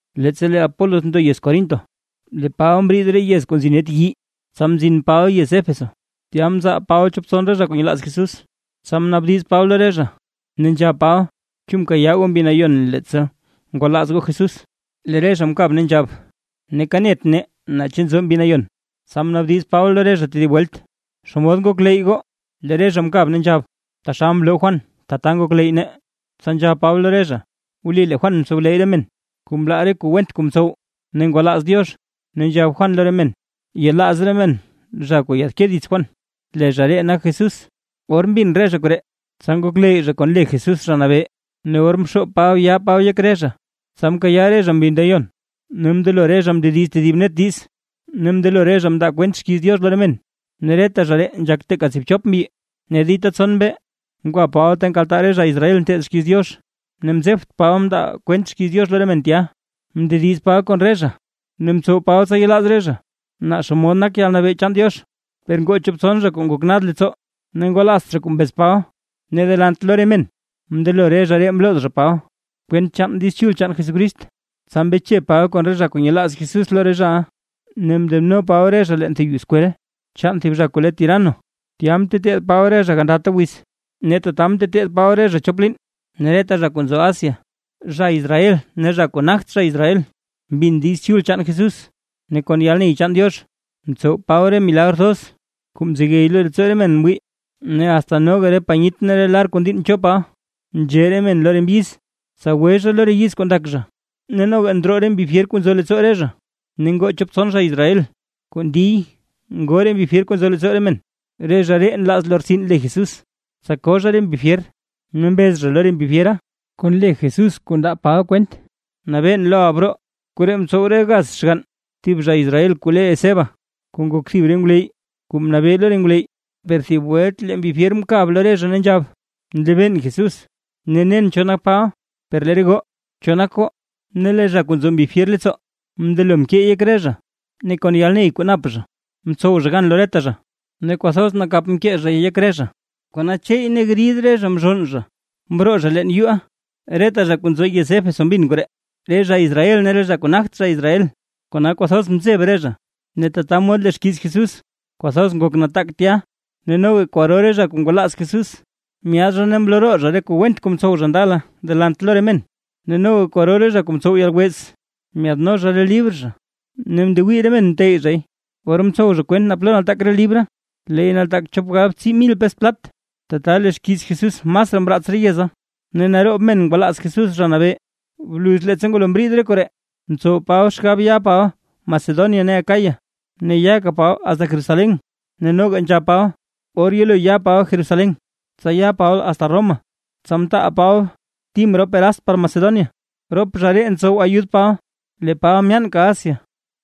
Leettsa lee Apolos ndo yez Corinto, lee Paba mriid re yez kuu nzi net yii, tsa mzin Paba yez Éfeso, tya mzal Paba chop tson zha kuu nyelaaz Jesús. Tsa mnaabdiz Paba lo re zha ne nzhab Paba: ―¿Chu mkayaaʼa goo Mbi Nayon leettsa ngwalaaz goo Jesús? Lee re zha mkab, ne nzhab: ―Neeka net nee naa chu nzo Mbi Nayon. Tsa mnaabdiz Paba lo re zha tedib welt: ―¿Xomod ngokleyy goo? Lee re zha mkab ne nzhab: ―Taxal mloo Juan, tata ngokleyy nee. Tsa nzhab Paba lo re zha: ―Wli lee Juan mtsowleyy re men, kuu mlaa re kuu went kuu ntsow ne ngwalaaz Diox, ne nzhab Juan lo re men, yelaaz re men zha kuu yaadke dits Juan. Lee zha ree nak Jesús. Or mbin re zha koree, tsa ngokleyy zha kon le Jesús Zha Nabee, ne or mxoob Paba yaa Paba yek re zha, tsa mkayaa re zha Mbi Nayon ne mndelo re zha mndediz zha tedib net diiz, ne mndelo re zha mndaa zha kwent xkiiz Diox lo re men. Ne reta zha ree nzhak teeka tsiibchop mbyi. Ne dita tson mbee ngwa Paba ta nkaltaa re zha Israel nteed xkiiz Diox, ne mzebt Paba mndaa Paba kwent xkiiz Diox lo re men tya. Mndediz Paba kon re zha ne mtsow Paba tsa yelaaz re zha naa xomod nak yalnabee chaan Diox. Per ngoo chop tson zha kuu ngok nad leettsoo ne ngwalaazt zha kuu mbez Paba, ne delant lo re men mndelo re zha ree mlooz zha Paba, kwent chaan Diiz Chul chaan Jesucrist. Tsa mbeche Paba kon re zha kuu nyelaaz Jesús lo re zhaʼa, ne mndeno Paba re zha leen thib yuu skwel chaan thib zha kuu le Tirano, tya mteteed Paba re zha gandata wiz. Ne tata mteteed Paba re zha chop liin, ne reta zha kuu nzo Asia, zha Israel ne zha kuu nagt zha Israel mbin Diiz Chul chaan Jesús. Ne kon yalney chaan Diox mtsow Paba re milagr thoz kuu mzegey leettsoo re men mwii, ne asta noga panyit ne re lar kuu ndiinn cho Paba nzhe re men lo re mbyiz, tsa gwe re zha lo re yiz kuu ndak zha, ne noga ndroo re mbi fyer kuu nzo leettsoo re zha. Ne ngoo chop tson zha Israel, kuu ndiy ngoo re mbi fyer kuu nzo leettsoo re men, re zha ree nlaaz lortsin le Jesús, tsa koo zha re mbi fyer, ne mbez zha lo re mbi fyera: ―Kon le Jesús kuu ndaa Paba kwent nabeen loʼa broo. Koree mtsow re gaz xgann thib zha Israel kuu le Esceva, kuu ngok thib re ngwleyy kuu mnabee lo re ngwleyy. Per thib welt lee mbi fyer mkab lo re zha ne nzhab: ―Nlebeen Jesús, ne nen cho nak Paba, per lee re goo, ¿cho nak goo? Ne lee zha kuu nzo mbi fyer leettsoo, mndelo mkeey yek re zha, ne kon yalney kuu nap zha mtsow zha gan lo reta zha, ne kwathoz nakap mkee zhay yek re zha, kona cheey ne grid re zha mzhonn zha mroo zha leen yuuʼa. Reta zha kuu nzo yez Éfeso mbin koree, re zha Israel ne re zha kuu nagt zha Israel, kona kwathoz mzeb re zha, ne tata mod lee xkiiz Jesús kwathoz ngok nataak tya. Ne noga kwaro re zha kuu ngwalaaz Jesús, myaad zha ne mloo roo re zha re kuu went kuu mtsow zha ndala delant lo re men, ne noga kwaro re zha kuu mtsow yalwez, myaadno zha re libr zha ne ndewii re men mteyy zhay. Or mtsow zha kwent naa plo nataak re libra. Leey nataak chop galbtsii mil pes plat. Tata lee xkiiz Jesús masraa mraats re yeza ne naroob men ngwalaaz Jesús Zha Nabee. Bluz leettsa ngwalo mriid re koree, mtsow Paba xgab ya Paba Macedonia ne Acaya, ne yaka Paba asta Jerusalén, ne noga nzhab Paba, or yelo ya Paba Jerusalén, tsa ya Paba asta Roma. Tsa mtaal Paba Tim rop Erast par Macedonia rop zha ree ntsow ayud Paba, lee Paba myaanka Asia.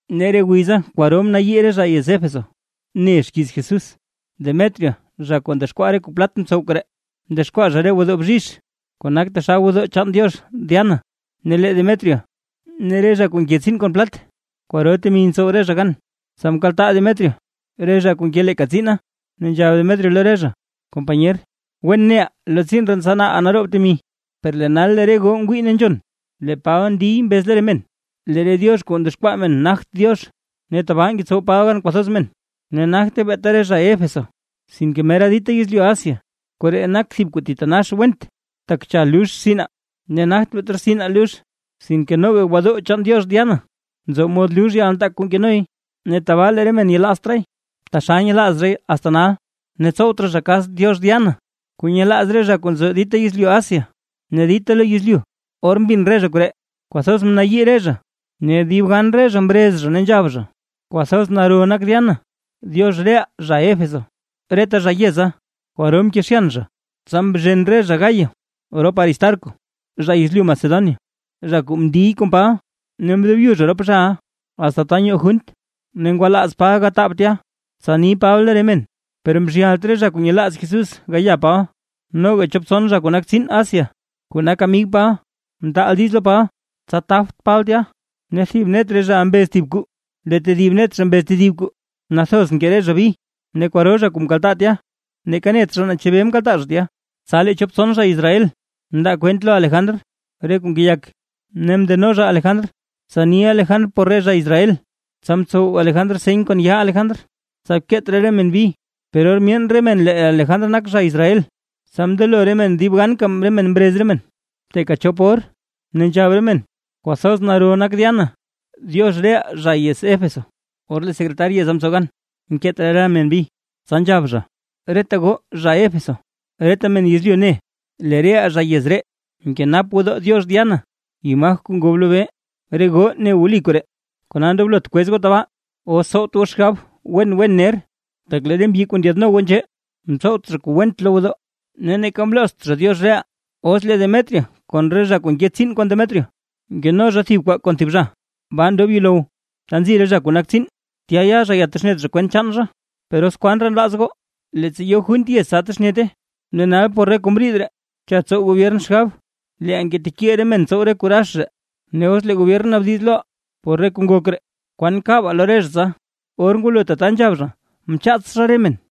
Ne re wiza kwaro mnayii re zha yez Éfeso ne xkiiz Jesús. Demetrio zha kuu ndexkwaa re kuu plat mtsow koree, ndexkwaa zha re gwodoo bzhizh, kuu nak taxal gwodoo chaan diox Diana, ne lee Demetrio ne re zha kuu nke tsiin kon plat, kwaro temi ntsow re zha gan. Tsa mkaltaa Demetrio re zha kuu nke leeka tsiina, ne nzhab Demetrio lo re zha: ―Companyer: Wen neʼaa lo tsiin ree ntsanaaʼaa naroob temi. Per lee nal lee re goo ngwii ne nzhon, lee Paba ndiy mbez lo re men, lee re diox kuu ndexkwaa men nagt diox, ne tabaa ngetsow Paba gan kwathoz men, ne nagte beeta re zha Éfeso sinke mera dita yezlyu Asia. Koree nak thib kuu thitanax went, tak cha lux rtsinaa, ne nagt beeta rtsinaa lux, sinke noga gwodoo chaan diox Diana nzo mod lux yalnataak kuu nkenoy. Ne tabaa lee re men yelaazt raay, taxal nyelaaz zhay asta nal, ne tsowt raa zha kas diox Diana, kuu nyelaaz re zha kuu nzo dita yezlyu Asia ne dita lo yezlyu. Or mbin re zha koree, kwathoz mnayii re zha, ne dib gan re zha mrez zha ne nzhab zha: ―¡Kwathoz naro nak Diana, diox reʼaa zha Éfeso! Reta zha yeza, kwaro mkezhyan zha. Tsa mzhen re zha Gayo rop Aristarco zha yezlyu Macedonia, zha kuu mndiy kon Paba, ne mdobyu zha rop zhaʼa asta ta nyoo junt. Ne ngwalaaz Paba gataab tya, tsa ni Paba lo re men, per mzhyalt re zha kuu nyelaaz Jesús gaya Paba. Noga chop tson zha kuu nak tsiin Asia, kuu nak amig Paba, mtaal diiz lo Paba tsa tabt Paba tya. Ne thib net re zhaʼa mbez thib kuu lee tedib net zha mbez tedib kuu, nathoz nkee re zha bi, ne kwaro zha kuu mkaltaa tya neeka net zha naa chebee mkaltaa zha tya. Tsa lee chop tson zha Israel mndaa kwent lo Alejandr re kuu ngeyak, ne mndeno zha Alejandr tsa ni Alejandr por re zha Israel, tsa mtsow Alejandr seny kon yaa Alejandr, tsa keet raa re men bi. Per or myeen re men lee Alejandr nak zha Israel, tsa mndelo re men dib gan re men mrez re men teeka chop or ne nzhab re men: ―¡Kwathoz naro nak Diana, diox reʼaa zha Éfeso! Or lee secretar yeza mtsow gan mkeet raa re men bi, tsa nzhab zha: ―Reta goo zha Éfeso, reta men yezlyu ne, lee reʼaa zha yez ree nkenap gwodoo diox Diana, imaj kuu ngob lobee. Re goo ne wli koree, kona ndoblot kwez goo tabaa, os tsowt goo xgabe wen wen ner. Tak lee re mbyi kuu ndyaadno goo nzhee, mtsowt zha kuu went lo gwodoo ne neeka mloozt zha diox reʼaa. Os lee Demetrio kon re zha kuu nke tsiin kon Demetrio nkeno zha thib kwaa kon thib zha, baa ndob yuulow, ta nzi re zha kuu nak tsiin, tya ya zha yatexnet zha kwent chaan zha. Per os kwan raa nlaaz goo, leettsa yo junt yez tsa texnete. Ne nal por re kuu mriid ree, cha tsow gobyern xgab leeʼaa ngetekiil re men tsow re kuu rax ree, ne os lee gobyern naabdiz loʼaa por re kuu ngok ree, ¿kwan kabaa lo re zha tsa? Or ngwalo tata nzhab zha, tsa mchaats zha re men.